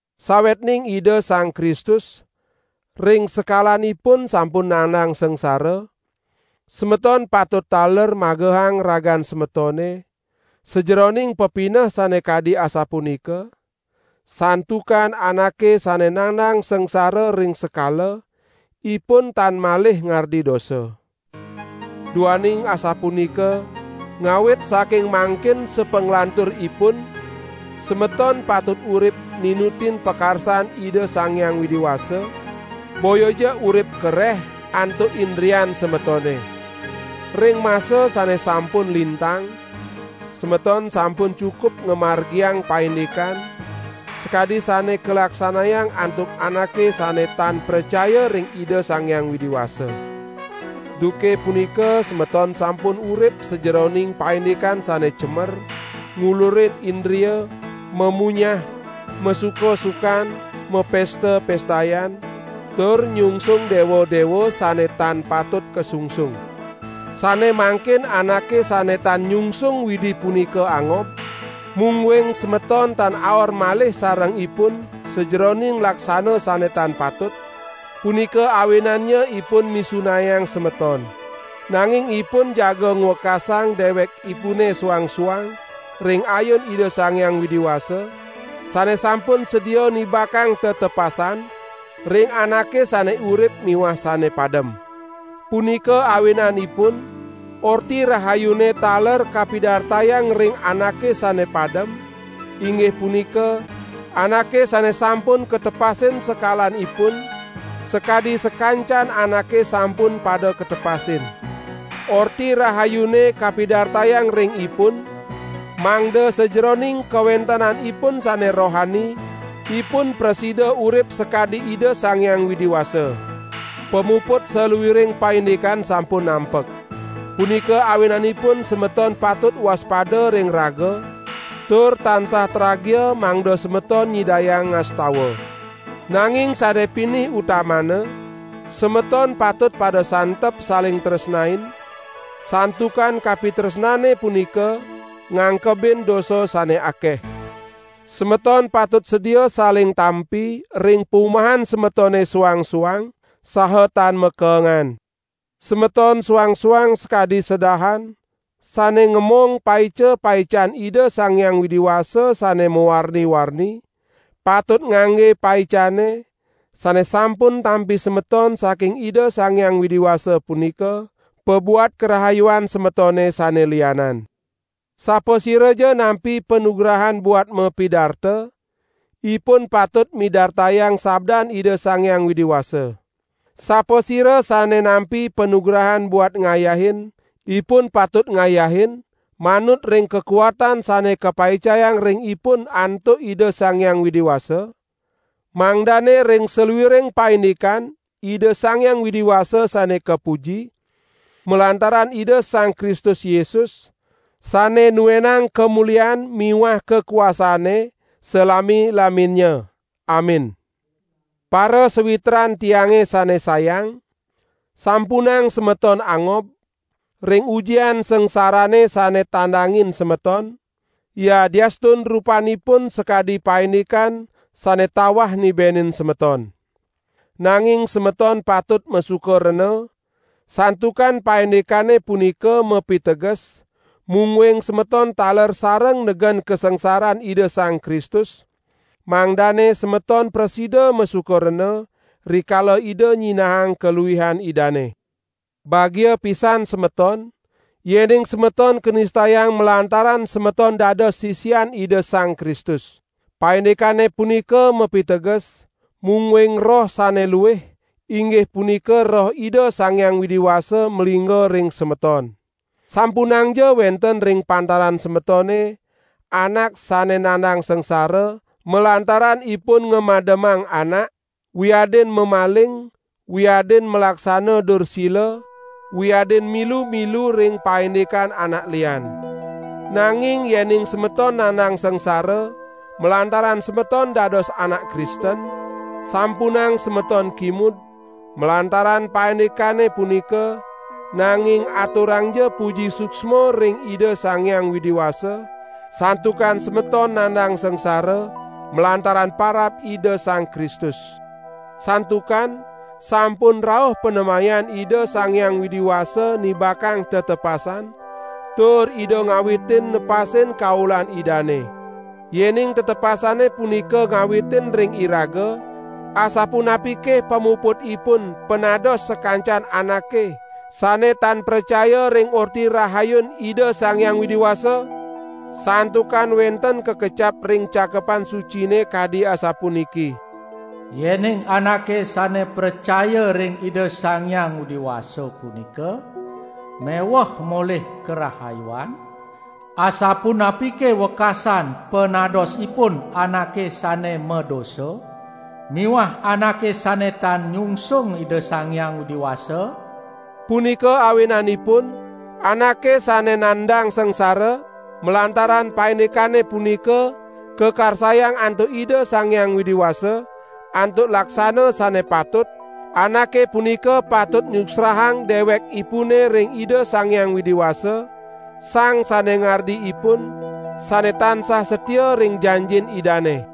Sawetning Ida Sang Kristus ring sekalanipun sampun nandang sangsara, semeton patut taler magehang ragan semetone sajeroning pepineh sane kadi asapunika, santukan anake sane nandang sangsara ring sekala, ipun tan malih ngardi dosa. Duaning asapunika ngawit saking mangkin sapanglanturipun semeton patut urip ninutin pakarsan Ida Sang Hyang Widi Wasa, boyaja urip kareh antuk indrian semetone. Ring masa sane sampun lintang semeton sampun cukup ngamargiang paindikan sakadi sane kalaksanayang antuk anake sane tan pracaya ring Ida Sang Hyang Widi Wasa. Duke punika semeton sampun urip sajeroning paindikan sane cemer, ngulurin indria, mamunyah, masuka-sukan, mapesta-pestayan, tur nyungsung dewa-dewa sane tan patut kasungsung. Sane mangkin anake sane tan nyungsung Widi punika angob, mungguing semeton tan aor malih sareng ipun sajeroning laksana sane tan patut, punika awinannya ipun misunayang semeton. Nanging ipun jaga ngwekasang dewekipune suang-suang ring ayun Ida Sang Hyang Widi Wasa, sane sampun sedia nibakang tetepasan ring anake sane urip miwah sane padem. Punika awinanipun Orti Rahayune taler kapidartayang ring anake sane padem, inggih punika anake sane sampun katepasin sekalanipun, sakadi sakancan anake sampun pada katepasin. Orti Rahayune kapidartayang ring ipun, mangda sajeroning kawentenanipun sane rohani ipun prasida urip sakadi Ida Sang Hyang Widi Wasa. Pamuput saluiring paindikan sampun nampek. Punika awinanipun semeton patut waspada ring raga tur tansah tragia mangda semeton nyidayang ngastawa. Nanging sane pinih utamana semeton patut pada santep saling tresnain, santukan kapitresnane punika ngangkebin dosa sane akeh. Semeton patut sedia saling tampi ring pumahan semetone suang-suang, saha tan makeengan. Semeton suang-suang sakadi sedahan sane ngamong paica-paican Ida Sang Hyang Widi Wasa sane mawarni-warni, patut ngangge paicane sane sampun tampi semeton saking Ida Sang Hyang Widi Wasa punika, pabuat karahayuan semetone sane lianan. Sapasiraja nampi panugrahan buat mapidarta, ipun patut midartayang sabdan Ida Sang Hyang Widi Wasa. Sapasira sane nampi panugrahan buat ngayahin, ipun patut ngayahin manut ring kakuatan sane kapaicayang ring ipun antuk Ida Sang Hyang Widi Wasa, mangdane ring saluiring paindikan Ida Sang Hyang Widi Wasa sane kapuji, malantaran Ida Sang Kristus Yesus, sane nuenang kamulian miwah kakuasane salami-laminnya. Amin. Parasawitran tiange sane sayang, sampunang semeton angob, ring ujian sangsarane sane tandangin semeton, yadiastun rupanipun sakadi paindikan sane tawah nibenin semeton. Nanging semeton patut masuka rena, santukan paindikane punika mapiteges, mungguing semeton taler sareng negen kasangsaran Ida Sang Kristus, mangdane semeton prasida masuka rena, rikala Ida nyinahang kaluihan Idane. Bagia pisan semeton, yening semeton kanistayang malantaran semeton dados sisian Ida Sang Kristus. Paindikane punika mapiteges, mungguing Roh sane luih, inggih punika Roh Ida Sang Hyang Widi Wasa malingga ring semeton. Sampunangja wenten ring pantaran semetone, anak sane nandang sangsara malantaran ipun ngamademang anak, wiadin mamaling, wiadin malaksana dursila, wiadin milu-milu ring paindikan anak lian. Nanging yening semeton nandang sangsara malantaran semeton dados anak Kristen, sampunang semeton kimud malantaran paindikane punika, nanging aturangja puji suksma ring Ida Sang Hyang Widi Wasa, santukan semeton nandang sangsara malantaran parab Ida Sang Kristus. Santukan sampun rauh panemayan Ida Sang Hyang Widi Wasa nibakang tetepasan, tur Ida ngawitin nepasin kaulan Idane. Yening tetepasane punika ngawitin ring iraga, asapunapike pamuputipun panados sakancan anake sane tan pracaya ring Orti Rahayun Ida Sang Hyang Widi Wasa? Santukan wenten kakecap ring Cakepan Sucine kadi asapuniki: "Yening anake sane pracaya ring Ida Sang Hyang Widi Wasa punika meweh molih karahayuan, asapunapike wekasan panadosipun anake sane madosa miwah anake sane tan nyungsung Ida Sang Hyang Widi Wasa?" Punika awinanipun, anake sane nandang sangsara malantaran paindikane punika kakarsayang antuk Ida Sang Hyang Widi Wasa, antuk laksana sane patut, anake punika patut nyuksrahang dewekipune ring Ida Sang Hyang Widi Wasa, Sang Sane Ngardi ipun, sane tansah satia ring janjin Idane.